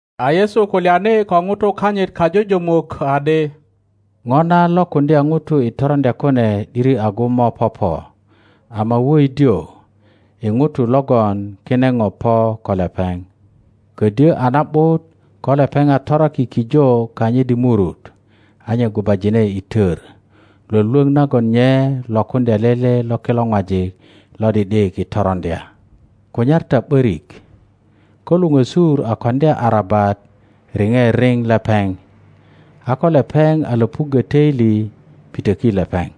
A Yesu kulyani ko ŋutu kanyit kajujumuk adi, Ŋo na lokuŋdya ŋutu i toroŋdya kune ’diri agu mo popo, ama woidio i ŋuto logon kine ŋo po ko lepeŋ. Kodyo a na ’but ko lepeŋ a toraki kijo kanyit i murut, a nye gubajine i tor, lwölwöŋ nagon nye lokuŋdya lele lo kilo ŋwajik lo ’di ’dik i toroŋdya. Kunyar ta ’borik; ko luŋösur a koŋdya arabat riŋe riŋ lepeŋ, a ko lepeŋ a löpuggö toili, pitöki lepeŋ.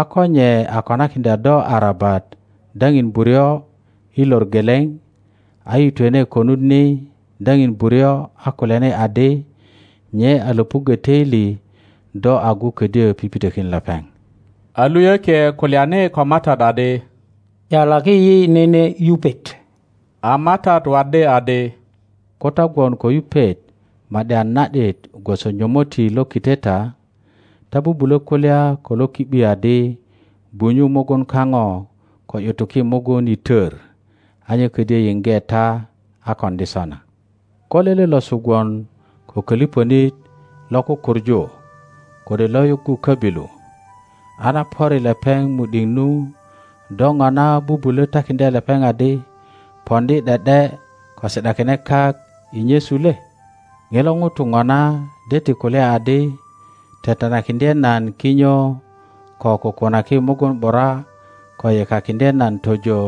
A ko nye a konakiŋdya do arabat daŋin buryo i lor geleŋ, a yitwene konut ni daŋin buryo a kulyani adi, nye a löpuggö toili, do agu ködyö pipitökin lepeŋ. A luyökie kulyani ko MATAT adi, ’Yalaki yi nene yupet! a MATAT waddi adi, Ko ta gwon ko yupet ma ’di a na ’dit gwoso nyomotti lo kiteta, ta bubulö kulya ko lo ki ’bi adi, Gwunyu mugun kaŋo ko ’yutuki mugun i tor, a nye ködyö yiŋge ta a koŋdi sona. Ko lele losu gwon ko köliŋönit lo kukuŋu kode lo yuggu köbilu, a na pöri lepeŋ mu ’diŋ nu, do ŋona bubulö takiŋdya lepeŋ adi, Poŋdi ’de ’de ko si ’dakine kak i nyesu le? Ŋilo ŋuto ŋona de ti kulya adi, Tetenakiŋdye nan kinyo, ko kukunaki mugun ’bura, ko yekakiŋdye nan tojo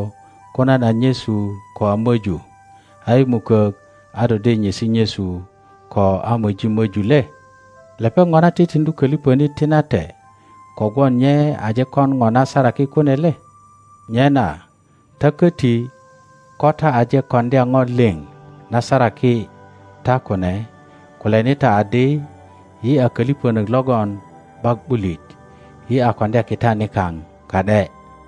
ko nan a nyesu ko a möju; a i mukok a do de nyesi nyesu ko a moji möju le? Lepeŋ ŋona titiŋdu köliŋönit tinate kogwon nye aje kon ŋo na saraki kune le? Nyena ta köti, ko ta aje koŋdya ŋo liŋ na saraki ta kune, kulyani ta adi, Yi a köliŋönök logon ’bak ’bulit; yi a koŋdya kita nikaŋ ka ’de.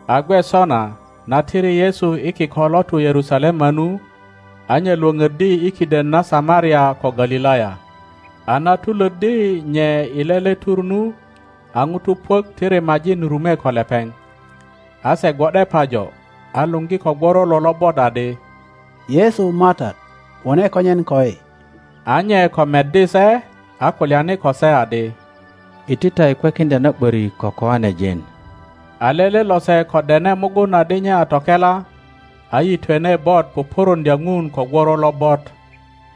A gwe sona, na tiri Yesu i kiko lo tu Yerusalema nu, a nye Iwoŋoddi i kiden na Samaria ko Galilaya. A na tulöddi nye i lele tur nu, a ŋutu puök ti rimajin rume ko lepeŋ. A se gwo ’de pajo, a luŋgi ko gworolo lobot adi, Yesu MATAT, wone konyen koyi. A nye ko meddi se, a kulyani ko se adi. Iti ta i kwekiŋdya na ’börik ko koanejin. A lele lose ko dene mugun adi nye a tokela. a yitwene bot pupuruŋdya Ŋun ko gworo lobot;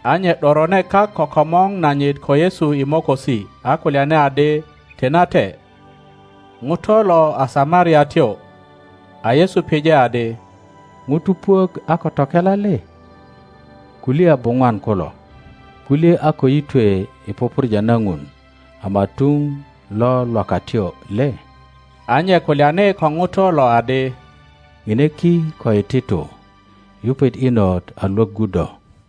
a nye ’dorone kak ko komor nanyit ko Yesu i mokosi, a kulyani adi, Tinate. Ŋuto lo a Samariatyo. A Yesu pije adi, Ŋutu puök a ko tokela le? Kuliya buŋwan kulo? Kulye a ko yitwe i pupurja na Ŋun ama tuŋ lo lwakatyo le? A nye kulyani ko ŋuto lo adi, Ome ki ko iti tu. Yupet inot a Iwoggu do.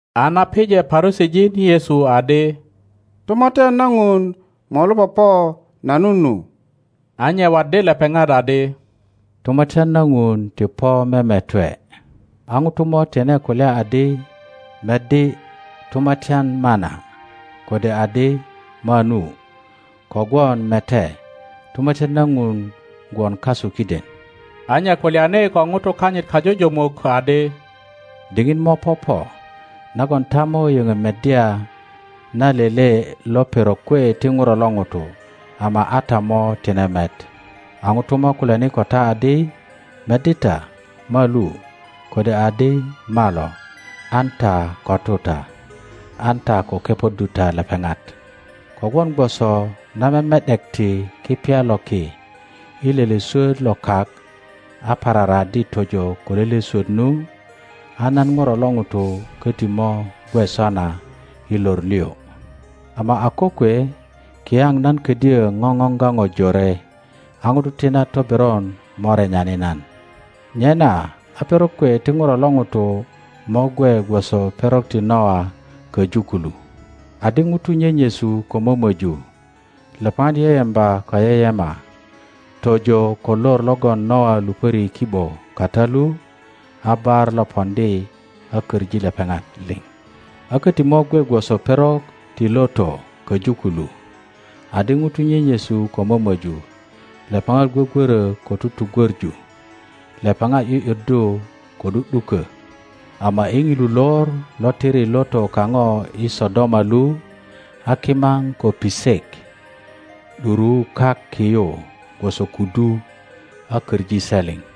A na pije Parusijin Yesu adi, Tumatyan na Ŋun molu popo nanu nu, a nye waddi lepeŋat adi, Tumatyan na Ŋun ti po memetwe. A ŋutu mo tine kulya adi, Meddi, Tumatyan mana, kode adi, Manu. Kogwon mete, Tumatyan na Ŋun gwon kasu kiden. A nye kulyani ko ŋutu kanyit kajujumuk adi, Diŋit mo popo nagon ta mo yoŋö meddya na lele lo perok kwe ti ŋuro lo ŋuto, ama a ta mo tine met. A ŋutu mo kulyani ko ta adi, Meddi ta, malu, kode adi, Malo! An ta ko tu ta, an ta ko kepoddu ta lepeŋat;kogwon gwoso na meme ’dekti kipya lo ki i lele swot lo kak a pararaaddi tojo ko lele swot nu, a nan ŋuro lo ŋuto koti mo gwe sona i lor liŋ. Ama a kokwe kiyaŋ nan ködyö ŋoŋoŋga ŋo jore, a ŋutu ti na toberon mo renyani nan. Nyena a perok kwe ti ŋuro lo ŋuto mo gwe gwoso perok ti Noa koju kulu; adi ŋutu nyenyesu ko momöju, lepeŋat yeyemba ko yeyema, tojo ko lor logon Noa lupöri i ki ’bo kata lu, a bar lo poŋdi a köŋi lepeŋat liŋ. —19.25a koti mo gwe gwoso perok ti Loto koju kulu: adi ŋutu nyenyesu ko mömoju, lepeŋat gwogwöro ko tugwöŋu, lepeŋat ’yu’yuddu ko ’du ’duko. Ama i ŋilu lor lo tiri Loto kaŋo i Sodoma lu, a kimaŋ ko pisek ’duruu kak ki yu gwoso kudu a koŋi se liŋ.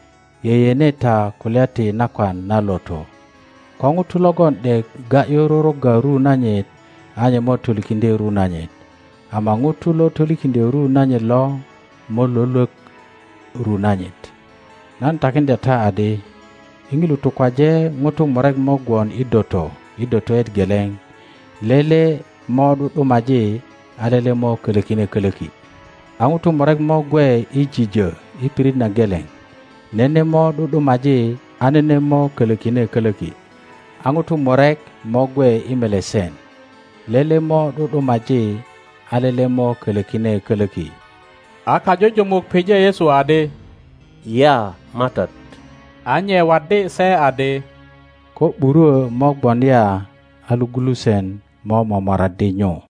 Yeyene ta kulya ti nakwan na Loto. Ko ŋuto logon ’dek ga ’yu rurugga ru nanyit a nye mo tolikiŋdye ru nanyit, ama ŋuto lo tolikiŋdyö ru nanyit lo mo lwölwok ru nanyit. Nan takiŋdya ta adi, i ŋilu tukwaje, ŋutu murek mo gwon i doto i dotoet geleŋ; lele mo ’du ’dumaji, a lele mo kölokine kölöki. A ŋutu murek mo gwe i jijö i pirit na geleŋ; nene mo ’du ’dumaji, a nene mo kölokine kölöki. [ A ŋutu murek mo gwe i melesen; lele mo ’du ’dumaji, a lele mo kölökine kolöki.] A kajujumuk pije Yesu adi, Ya, MATAT? A nye waddi se adi, Ko ’burwö mo gwon ya, a logulusen mo momoraddi nyu.